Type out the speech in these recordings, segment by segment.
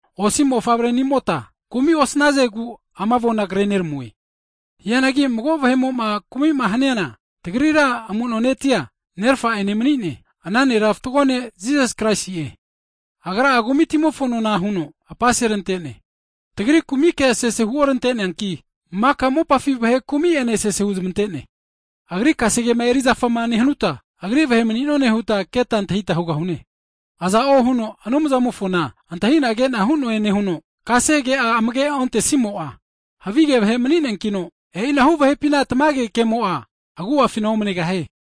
Osi mofavre'nimota kumi osnazegu ama avona kre'neramue. Hianagi mago vahe'mo'ma kumi'ma haniana, tagrira amu'no netia Nerafa'ene mani'ne, ana nera fatgo ne' Jisas Kraisi'e. Agra'a kumitimofona nona huno apaserante'ne, tagri kumike sese huorante'neanki, maka mopafi vahe kumi'ene sese huzmante'ne. Agri kase kema erizafa nehanuta, Agri vahe'mani'none huta keta antahita hugahune. Aza'o huno Anumzamofona antahi'na ke'na hu'noe nehuno, kasege'a amage ontesimo'a, havige vahe mani'neankino, e'inahu vahepina tamage kemo'a agu'afina omanegahie.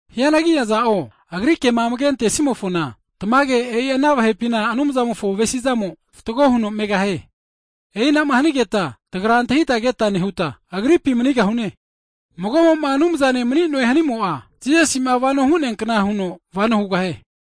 Hianagi aza'o Agri kema amage antesimofona, tamage e'i ana vahepina Anumzamofo avesi'zamo fatgo huno megahie. E'inama hanigeta tagra antahita keta nehuta, Agripi manigahune. Mago'mo'ma Anumzane mani'noe hanimo'a, Jisasi'ma vano hu'nea kna huno vano hugahie.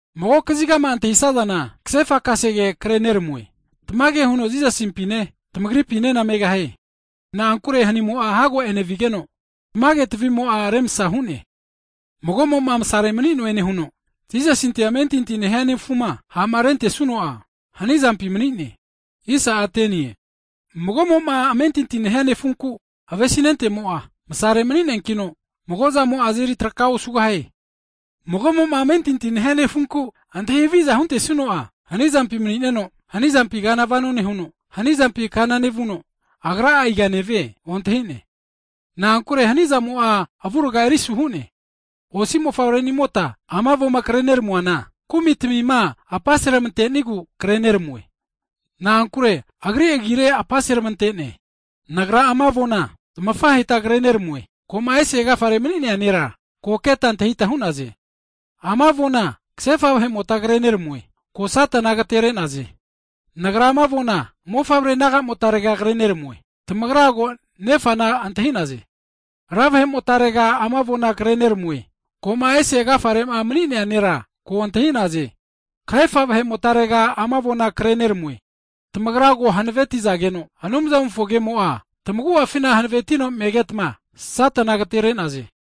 Mago kazigama antahisazana, kasefa kasege kreneramue, tamage huno Jisasimpine tamagripinena megahie. Na'ankure hanimo'a hago enevigeno, tamage tavi'mo'a remsa hu'ne. Mago'mo'ma masare mani'noe nehuno, Jisasinte amentinti nehia nefuma ha'ma rentesuno'a, hanizampi mani'ne. Mago'mo'ma amentinti nehia nefunku avesinentemo'a, masare mani'neankino mago'zamo'a azeri traka osugahie. Mago'mo'ma amentinti nehia nefunku antahi haviza huntesuno'a, hanizampi mani'neno, hanizampi kana nevuno, agra iga nevie ontahi'ne. Na'ankure hanizamo'a avuraga erisu hu'ne. Osi mofavrenimota ama avoma kre neramuana, Anumzamo'a Jisasi agifi kumitimima apaseramante'negu kreneramue. Na'ankure Agri Agire kumitimia apaseramante'ne. Nagra ama avona, tafahemota kre neramue, ko'ma ese agafare mani'nea nera, ko keta antahita hu'naze. Ama avona kasefa vahe'motma kre neramue, ko Satana agatere'naze. Nagra ama avona mofavre nagamotarega kre neramue, tamagra ko Nefana keta antahita hu'naze. Ra vahe'motarega ama avona kre neramue, ko'ma ese agafare'ma mani'nea Nera ko keta antahita hu'naze. Kahefa vahe'motarega ama avona kre neramue, tamagra ko hanavetizageno, Anumzamofo kemo'a tamagu'afina hanavetino megetma Satana agatere'naze.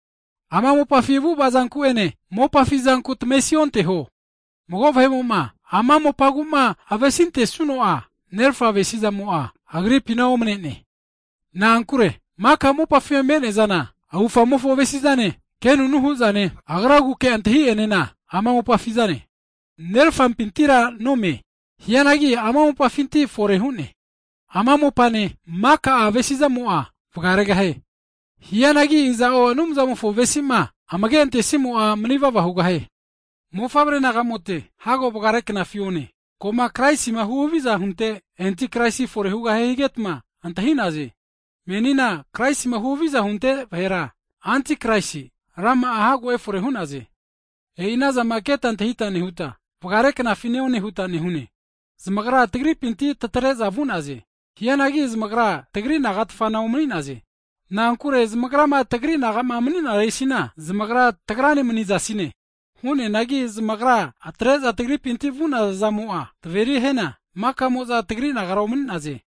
Ama mopafi avu'ava zanku'ene, mopafi zanku tamesionteho. Mago vahe'mo'ma ama mopagu'ma avesintesuno'a, Nerafa avesi'zamo'a agripina omane'ne. Na'ankure maka mopafi me'neazana, avufamofo avesi'zane, kenunu hu'zane, agraguke antahi'zanena ama mopafizane. Nerafapintira nome-e, hianagi ama mopafinti fore hu'ne. Ama mopane, maka'a avesi'zamo'a vagaregahie. Hianagi iza'o Anumzamofo avesi'ma amage'antesimo'a, manivava hugahie. Mofavre nagamote, hago vagare knafi one, ko'ma Kraisima huhaviza hunte havige anti Kraisi fore hugahie higetma antahi'naze. Menina Kraisima huhaviza hunte vahera havige enti Kraisi rama'a hago efore hu'naze. E'i anazama keta antahita nehuta, vagare knafi neone huta hugahune. Zamagra tagripinti tatre'za vu'naze, hianagi zamagra tagri naga tfana omani'naze. Na'ankure zamagrama tagri naga'ma mani'naresina, zamagra tagrane manizasine. Hu'neanagi zamagra atre'za tagripinti vu'naza zamo'a, taveri hiana, maka'mo'za tagri nagara omani'naze.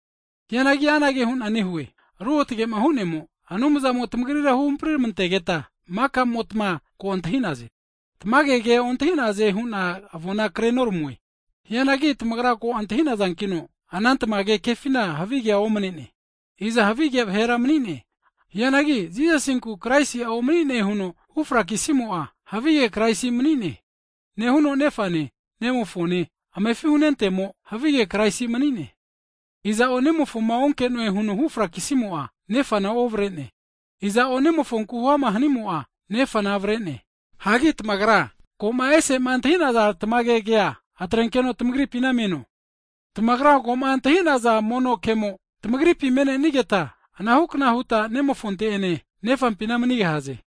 Hianagi anage hu'na nehue, Ruotage'ma Hu'nemo, Anumzamo tamagrira huhampri ramantegeta, maka'motma ko antahi'naze. Tamage ke ontahi'naze hu'na avona kre noramue, hianagi tamagra ko antahi'nazankino, ana tamage kefina havigea omane'ne. Iza havige vahera mani'ne? Hianagi Jisasinku Kraisi'a omani'ne huno hufrakisimo'a, agra havige anti kraisi nemanino, Nefane Nemofone amefi huntenimo'a, Kraisi ha' vahe mani'ne. Iza'o Nemofoma onke'noe huno hufrakisimo'a, Nefana ovare'ne. Aza'o nemofonku huama hanimo'a, Nefana avare'ne. Hagi tamagra, ko'ma ese'ma antahi'naza tamage kea atrenkeno tamagripina meno, tamagra ko'ma antahinaza mono kemo tamagripi me'nenigeta, anahu kna huta Nemofonte'ene Nefampina manigahaze.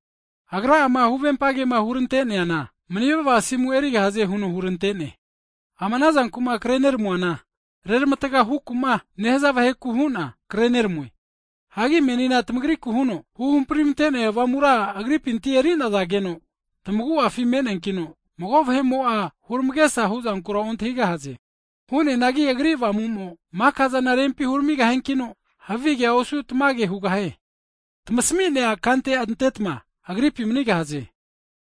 Agra'ama huvempa kema hurante'neana, mani'vava asimu erigahaze huno hurante'ne. Ama ana zanku'ma kre neramuana, reramataga huku'ma nehaza vaheku hu'na kre neramue. Hagi menina tamagriku huno, huhampri ramante'neaza Avamura Agripinti eri'nazageno tamagu'afi mani'neanki mago vahe'mo'a huramagesa hu'zankura ontahigahaze. Hu'neanagi Agri Avamu'mo maka'zana rempi huramigahiankino havi kea osu tamage hugahie. Tamasmi'nea kante antetma Agripi manigahaze.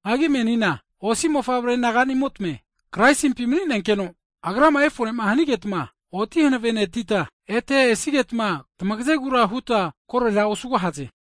Hagi menina osi mofavre naganimote, Kraisimpi mani'nenkeno, Agrama efore'ma hanigetma oti hanavenetita, ete esigetma tamagazegura huta korera osugahaze.